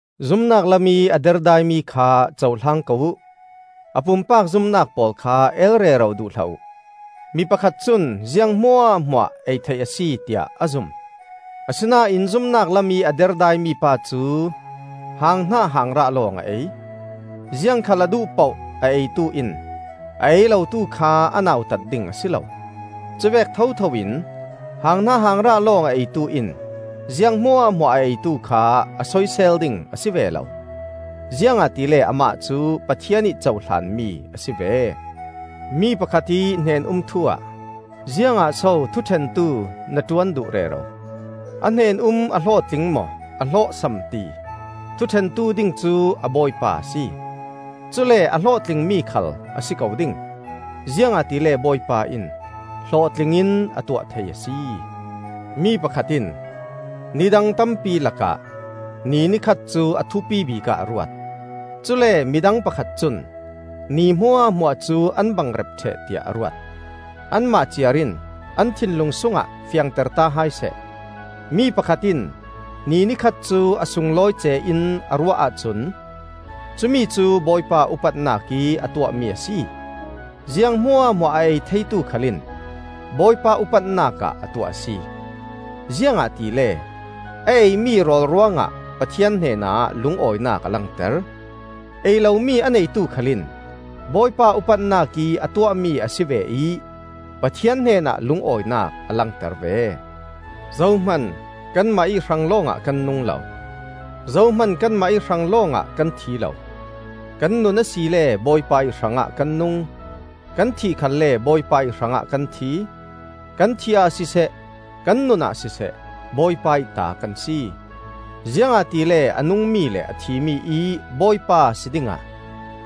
Zumnak lamih a derdaimi kha cohlang ko uh; a pumpak zumnak pawl kha eel rero duh hlah uh. Mi pakhat cun ziang hmuahhmuah ei theih a si, tiah a zum; asinain zumnak lamih a derdaimi pa cu hanghnah hangrah lawng a ei. Ziangkhal a duh poh a eitu in a ei lotu kha a nautat ding a si lo; cuvek thotho in hanghnah hangrah lawng a eitu in ziang hmuahhmuah a eitu kha a soisel ding a si ve lo; ziangahtile amah cu Pathian ih cohlan mi a si ve. Mi pakhat ih hnen-um thu-ah ziangah so thuṭhentu na ṭuan duh rero? A hnen-um a hlawhtling maw a hlawhsam ti thuṭhentu ding cu a bawipa a si. Cule a hlawhtlingmi khal a si ko ding, ziangahtile Bawipa in hlawhtling in a tuah thei a si. Mi pakhat in ni dang tampi lakah ni ni khat cu a thupibik ah a ruat; cule midang pakhat cun ni hmuahhmuah cu an bangrep ṭheh tiah a ruat. Anmah ciar in an thinlung sungah fiangterta hai seh. Mi pakhat in ni ni khat cu a sunglawi ce in a ruah ahcun cu mi cu Bawipa upatnak ih a tuahmi a si; ziang hmuahhmuah a ei theitu khal in Bawipa upatnak ah a tuah a si; ziangahtile a ei mi rawl ruangah Pathian hnenah lungawinak a langter. Ei lomi a neitu khal in Bawipa upatnak ih a tuahmi a si ve ih Pathian hnenah lungawinak a langter ve. Zohman kanmah ih hrang lawngah kan nung lo; zohman kanmah ih hrang lawngah kan thi lo. Kan nun asile Bawipa ih hrangah kan nung; kan thih khalle Bawipa ih hrangah kan thi. Kan thih ah siseh, kan nun ah siseh Bawipa ih ta kan si. Ziangahtile a nungmi le a thimi ih Bawipa si dingah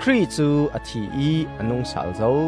Khrih cu a thi ih a nungsal zo.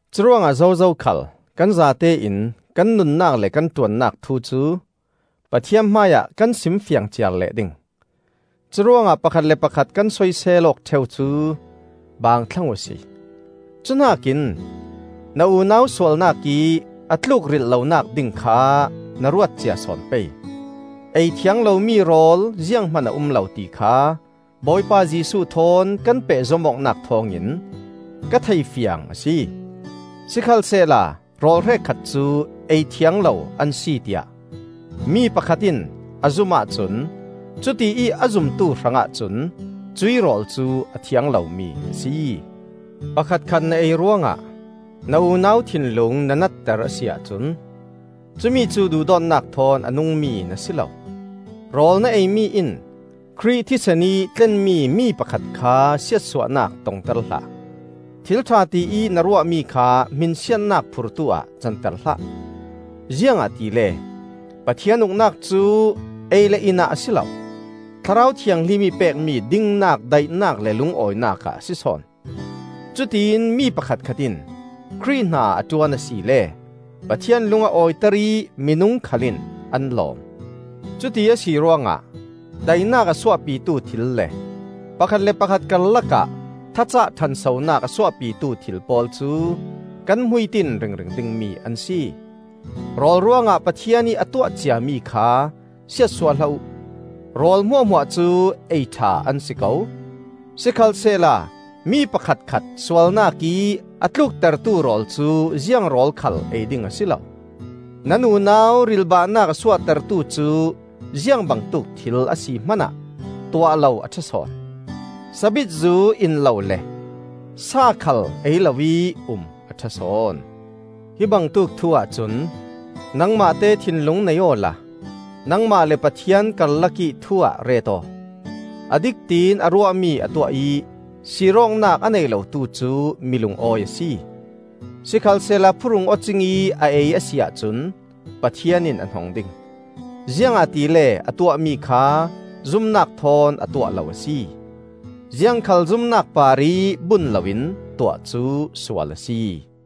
Curuangah zozo khal kan zatein kan nunnak le kan ṭuannak thu cu Pathian hmaiah kan simfiang ciar leh ding. Curuangah pakhat le pakhat kan soisel awk ṭheu cu baang thlang uhsi. Cuhnakin na unau sualnak ih a tlukrilh lonak ding kha na ruat cia sawn pei. Ei thiang lomi rawl zianghman a um lo ti kha Bawipa Jesuh thawn kan pehzom awknak thawngin ka thei fiang a si. Sikhalsehla rawl hrekkhat cu ei thiang lo an si tiah mi pakhat in a zum ahcun cutiih a zumtu hrangah cun cuih rawl cu a thiang lomi a si. Pakhatkhat na ei ruangah na unau thinlung na natter a si ahcun cumicu duhdawtnak thawn a nungmi na si lo. Rawl na ei mi in Khrih thisen ih tlenmi mi pakhat kha siatsuahnak tongter hlah. Thil ṭha tiih na ruahmi kha hminsiatnak phurtu ah canter hlah. Ziangahtile Pathian Uknak cu ei le in ah a si lo; Thlarau Thianghlim ih pekmi dingnak, daihnak le lungawinak ah a si sawn. Cutiin mi pakhatkhat in Khrih hna a ṭuan asile Pathian lung a awiter ih minung khal in an lawm. Cuti a si ruangah, daihnak a suahpitu thil le pakhat le pakhat karlakah thacah ṭhansonak a suahpitu thil pawl cu kan hmuitin ringring dingmi an si. Rawl ruangah Pathian ih a tuah ciami kha siatsuah hlah uh. Rawl hmuahhmuah cu ei ṭha an si ko, sikhalsehla mi pakhatkhat sualnak ih a tluktertu rawl cu ziang rawl khal ei ding a si lo. Nan unau rilhbahnak a suahtertu cu ziang bangtuk thil a si hmanah tuah lo a ṭha sawn; sabit zu in lo le sa khal ei loih um a ṭha sawn. Hi bangtuk thu-ah cun nangmahte thinlung nei aw la nangmah le Pathian karlakih thu-ah ret aw. A dik tiin a ruahmi a tuah ih sirawknak a nei lotu cu mi lungawi a si! Sikhalsehla phuhrung aw cingih a ei a si ahcun Pathian in a hnong ding, ziangahtile a tuahmi kha zumnak thawn a tuah lo a si. Ziangkhal zumnak parih bun loin tuah cu sual a si.